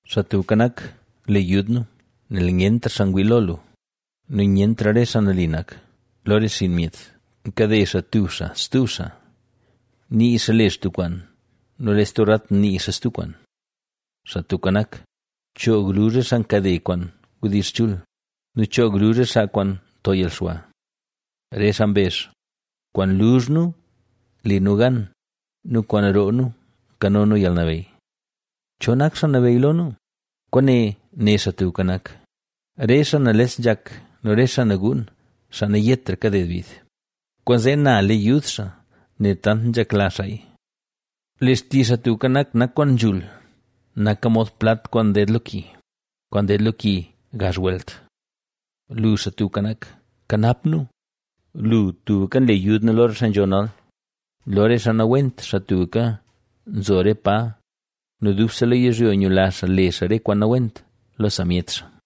Xaa Tubka Nak, le yud nu; ¡nel nyentra xaa ngwii lo lu nu nyentra re xaa nali nak lo re xinn myet! Nkade xaa tub xaa stub xaa. Nii xaa le xaa tub kwaan, nu lee stub rat nii xaa stub kwaan. Xaa Tubka Nak, choog luzh re xaa nkade kwaan wdizh chul nu choog luzh re xaa kwaan nto yalxwa. Re xaa mbezh: “Kwaan luzh nu le nu gan nu kwaan roo nu nkano nu yalnabeyy. ¿Cho nak xaa nabeyy lo nu?” Kwaane né Xaa Tubka Nak: “Re xaa nales nzhak nu re xaa naguun, xaa nayetra kaded bid, kwaanzee na le yud xaa nel tant nzhekla xaaya”. Lee xtizh Xaa Tubka Nak, nak kwaan nzhul, naka mod plat kwaan nded lo ki, kwaan nded lo ki gazh welt. Lu, Xaa Tubka Nak, nkanap nu; lu, tubka nle yud nu lo re xaa nzho nal, lo re xaa nawent, xaa tubka nzo re pa, nu dubse lo yizhyo nyula xaa le xaa re kwaan nawent lo samyet xaa.